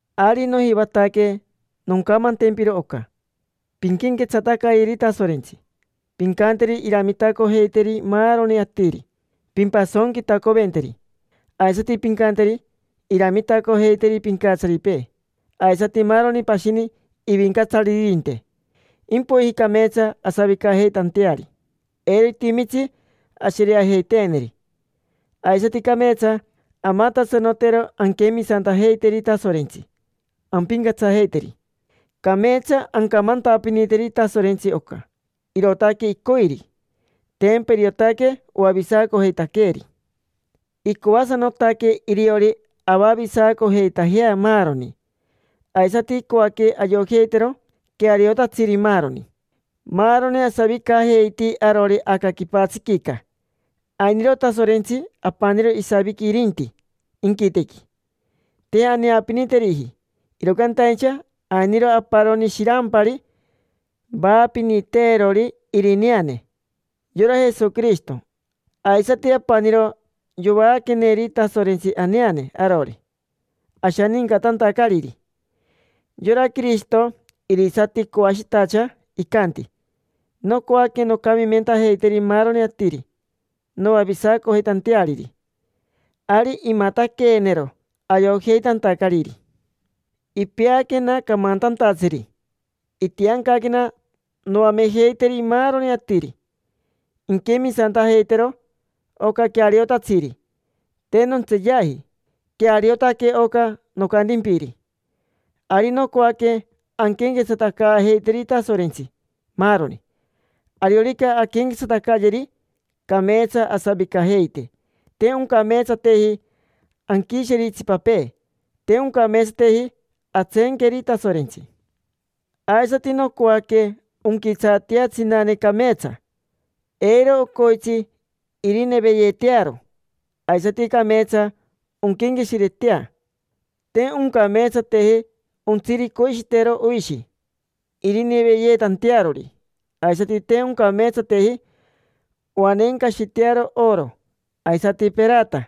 Ari nojivataque noncamantempiro oca: pinquenquetsatacayeri Tasorentsi, pincanteri iramitacojeiteri maaroni atiri, pimpasonquitacoventeri. Aisati pincanteri iramitacojeiteri pincatsaripee aisati maaroni pashini ivincatsaririnte, impoiji cameetsa asavicajeitanteari, eiro itimitsi ashereajeiteeneri. Aisati cameetsa amatasanotero anquemisantajeiteri Tasorentsi, ampincatsajeiteri. Cameetsa ancamantapiniteri Tasorentsi oca, irootaque icoiri; tempa iriotaque oavisacojeitaqueeri. Icoasanotaque iriori avavisacojeitajea maaroni, aisati icoaque ayojeitero queariotatsiri, maaroni. Maaroni asavicajeiti arori aca quipatsiquica. Ainiro Tasorentsi apaniro, isaviqui irinti inquitequi. Te aneapiniteriji, iro cantaincha ainiro aparoni shirampari vaapiniteerori irineane: yora Jesoquirishito. Aisati apaniro yovaaqueneri Tasorentsi aneane arori, ashanincatantacariri. Yora Quirishito, irisati coashitacha, icanti: “Nocoaque noncamimentajeiteri maaroni atiri noavisacojeitanteariri”. Ari imataqueenero ayojeitantacariri. Ipeaquena camantantatsiri, itiancaquena noamejeiteri maaroni atiri inquemisantajeitero oca queariotatsiri. Te nontseeyaji, queariotaque oca nocantimpiri. Ari nocoaque anquenquetsatacaajeiteri Tasorentsi, maaroni. Ariorica anquenquetsatacayeri, cameetsa asavicajeite: te oncameetsateji anquisheri itsipapee, te oncameetsateji antseenqueri Tasorentsi. Aisati nocoaque onquitsaatea tsinane cameetsa, eiro ocoitsi irineveyeetearo, aisati cameetsa onquenqueshiretea. Te oncameetsateji ontsiricoishitero oishi irineveyeetantearori, aisati te oncameetsateji oaneencashitearo oro, aisati perata.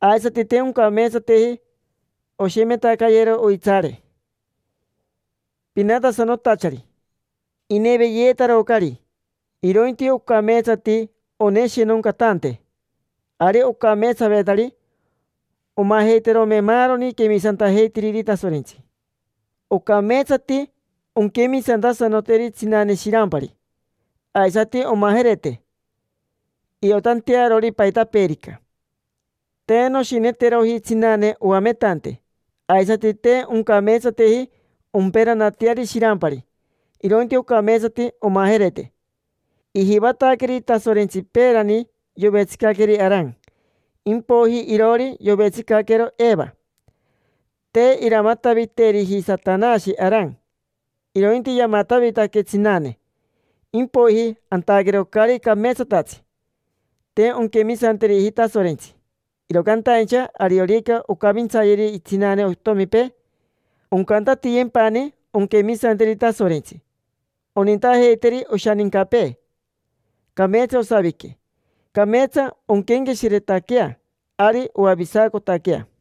Aisati te oncameetsateji oshemetacayero oitsaare pinatasanotachari: ineveyeetarocari. Irointi ocameetsati oneshinoncatante: ari ocameetsavetari omajeiterome maaroni quemisantajeitiriri Tasorentsi. Ocameetsati onquemisantasanoteri tsinane shirampari, aisati omajerete, iotantearori paitapeerica. Te noshineteroji tsinane oametante, aisati te oncameetsateji omperanateari shirampari, irointi ocameetsati omajerete. Ijivataqueri Tasorentsi peerani yovetsicaqueri Aran, impoiji iroori yovetsicaquero Eva. Te iramataviteriji Satanashi Aran, irointi yamatavitaque tsinane, impoiji antaquero caari cameetsatatsi: te onquemisanteriji Tasorentsi. Iro cantaincha ariorica oncavintsayeri tsinane otomipee, oncantatiyempani onquemisanteri Tasorentsi, onintajeiteri oshanincapee, cameetsa osavique, cameetsa onquenqueshiretaquea, ari oavisacotaquea.